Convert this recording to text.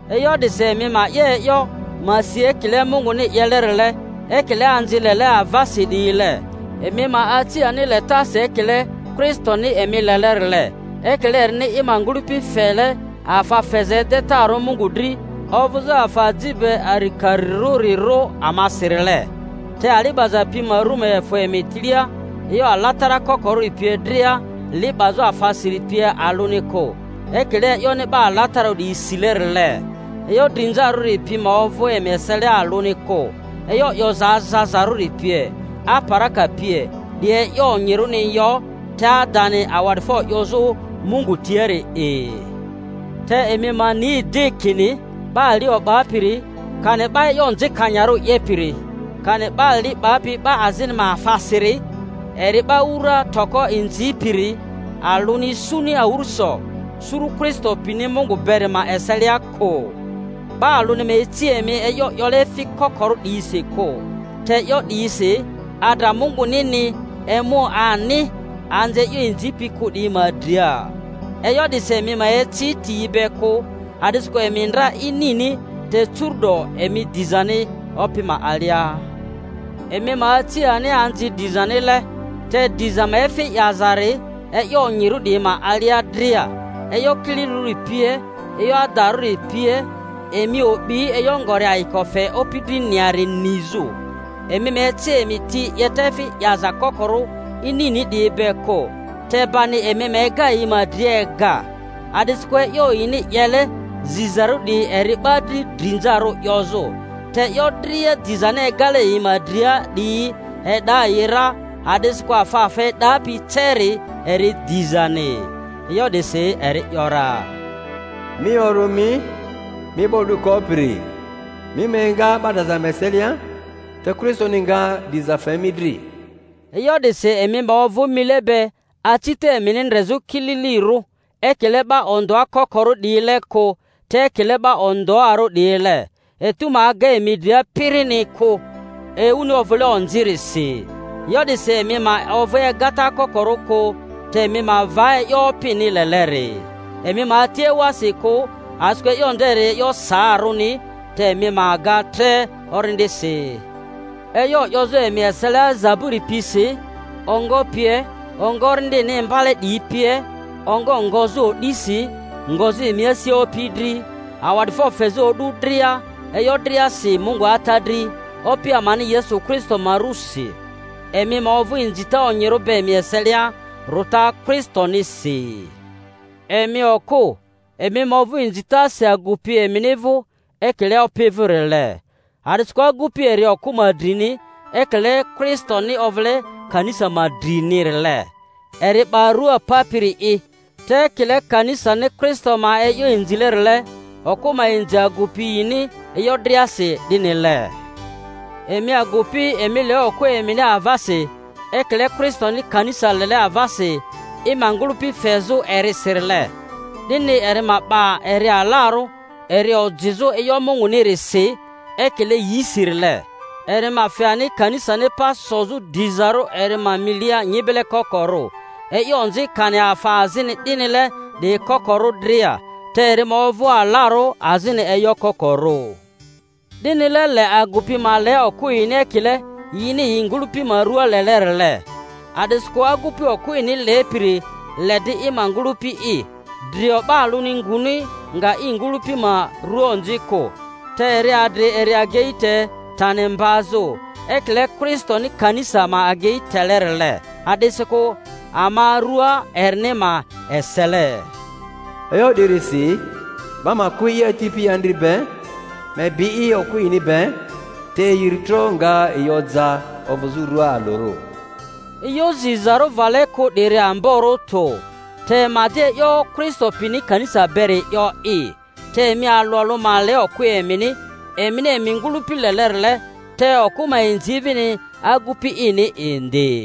E'yo 'disi emi ma 'ye e'yo, ma si ekile Munguni 'yelerile, ekile anzi lele avasi 'diyile. Emi ma aci ani letasi ekile Kristoni emi lelerile, ekile erini i ma ngᴜlᴜpi fele afa feza edetarᴜ Mungu dri ovᴜzᴜ afa aji be arikarirᴜrirᴜ amasirile. Te ali 'baza pi ma ru ma efᴜ emi tilia e'yo alatara kokorᴜri pie dria, li 'bazᴜ afasiri pie alᴜni kᴜ, ekile e'yoni 'ba alatararᴜ 'diyi silerile. E'yo drinzarᴜri pi ma ovᴜ emi eselia alᴜni kᴜ, e'yo 'yoza azazarᴜri pie, aparaka pie, 'diyi e'yo onyirᴜni yo; te adani awa'difo 'yozᴜ Mungu tiari'i. Te emi ma ni 'di, kini, 'ba ali o'bapiri kani 'ba e'yo onzikanyarᴜ 'yepiri, kani 'ba li 'bapi 'ba azini ma afasiri (eri 'ba wura toko inzipiri) alᴜni isuni awᴜrᴜso suru Kristo pini Mungu beri ma eselia kᴜ. 'Ba alᴜni ma ici emi e'yo 'yole efi kokorᴜ 'diyisi kᴜ, te e'yo 'diyisi adra Mungunini emu ani anzi e'yo inzipi kᴜ 'diyi ma dria. E'yo 'disi emi ma eci ti yi be kᴜ, a'disikᴜ emi ndra inini, te curu'do emi dizani Opi ma alia; emi ma aci ani anzi dizanile (te diza ma efi 'yazari eyo onyirᴜ 'diyi ma alia dria, e'yo kililirᴜri pie, e'yo adarᴜri pie), emi o'bi e'yo ngori ayiko fe Opi driniari nizᴜ. Emi ma eci emi ti 'yeta efi 'yaza kokorᴜ inini 'diyi be kᴜ, te bani emi ma ega yi ma dria ega. A'disikᴜ e'yo yini 'yele zizarᴜ 'diyi eri 'ba dri drinzarᴜ 'yozᴜ; te e'yo dria dizani egale yi ma dria 'diyi e'da yi ra, a'disikᴜ afa afa e'dapi ceri eri dizani. E'yo 'disi eri ‘yora, Mi orᴜ mi, mi 'ba o'du kopiri, mi ma enga 'ba draza ma eselia, te Kristoni nga diza fe mi dri. E'yo 'disi emi ma ovᴜ mile be acita emini ndrezᴜ kililirᴜ, ekile 'ba ondᴜa kokorᴜ 'diyile kᴜ, te ekile 'ba ondᴜarᴜ 'diyile; etu ma aga emi dria pirini kᴜ, ewuni ovᴜle onzirisi. E'yo 'disi emi ma ovᴜ egata kokorᴜ kᴜ, te emi ma va e'yo Opini leleri. Emi ma ati ewasi kᴜ, a'disikᴜ e'yo nderi e'yo saarᴜni; te emi ma ga tre Orindisi, e'yo 'yozᴜ emi eselia zaburi pisi, ongo pie, ongo Orindini imbale 'diyi pie, ongo ngozᴜ o'disi, ngozᴜ emi asia Opi dri, awa'difo fezᴜ o'du dria e'yo driasi Mungu Ata dri, Opi amani Yesu Kristo ma rᴜsi. Emi ma ovᴜ inzita onyirᴜ be emi eselia rᴜta Kristonisi. Emi okᴜ, emi ma ovᴜ inzitasi agupi emini vᴜ ekile Opi vᴜrile. A'disikᴜ agupi eri okᴜ ma drini, ekile Kristoni ovᴜle kanisa ma drinirile, eri 'ba rua papiri'i. Te ekile kanisani Kristo ma e'yo inzilerile, okᴜ ma inzi agupi yini e'yo driasi 'dinile. Emi agupi, emi le okᴜ emini avasi ekile Kristoni kanisa lele avasi i ma ngᴜlᴜpi fezᴜ erisirile, 'dini eri ma 'ba eri alarᴜ, eri ojizᴜ e'yo Mungunirisi, ekile yisirile, eri ma fe ani kanisani pa sozᴜ dizarᴜ eri ma milia nyibele kokorᴜ, e'yo onzi kani afa azini 'dinile 'diyi kokoro dria, te eri ma ovᴜ alarᴜ azini e'yo kokorᴜ. 'Dinile le agupi ma le okᴜ yini ekile yini yi ngᴜlᴜpi ma rᴜa lelerile. A'disikᴜ agupi okᴜ ini lepiri le 'di i ma ngᴜlᴜpi'i. Drio 'ba alᴜni nguni nga i ngᴜlᴜpi ma rua onzi kᴜ, te eri adri eri agei te tani mbazᴜ, ekile Kristoni kanisa ma agei telerile, a'disikᴜ ama rua erini ma esele. E'yo 'dirisi 'ba ma kᴜ i ati pi andri be, ma ebi i okᴜ ini be, te yi iri tro nga yi oja ovᴜzᴜ rua alᴜrᴜ. E'yo zizarᴜ vale kᴜ 'diri amborᴜ tᴜ, te ma 'di e'yo Kristo pini kanisa beri 'yo'i. Te emi alᴜ alᴜ ma le okᴜ emini, emini emi ngᴜlᴜpi lelerile, te okᴜ ma inzi vini agupi ini indi.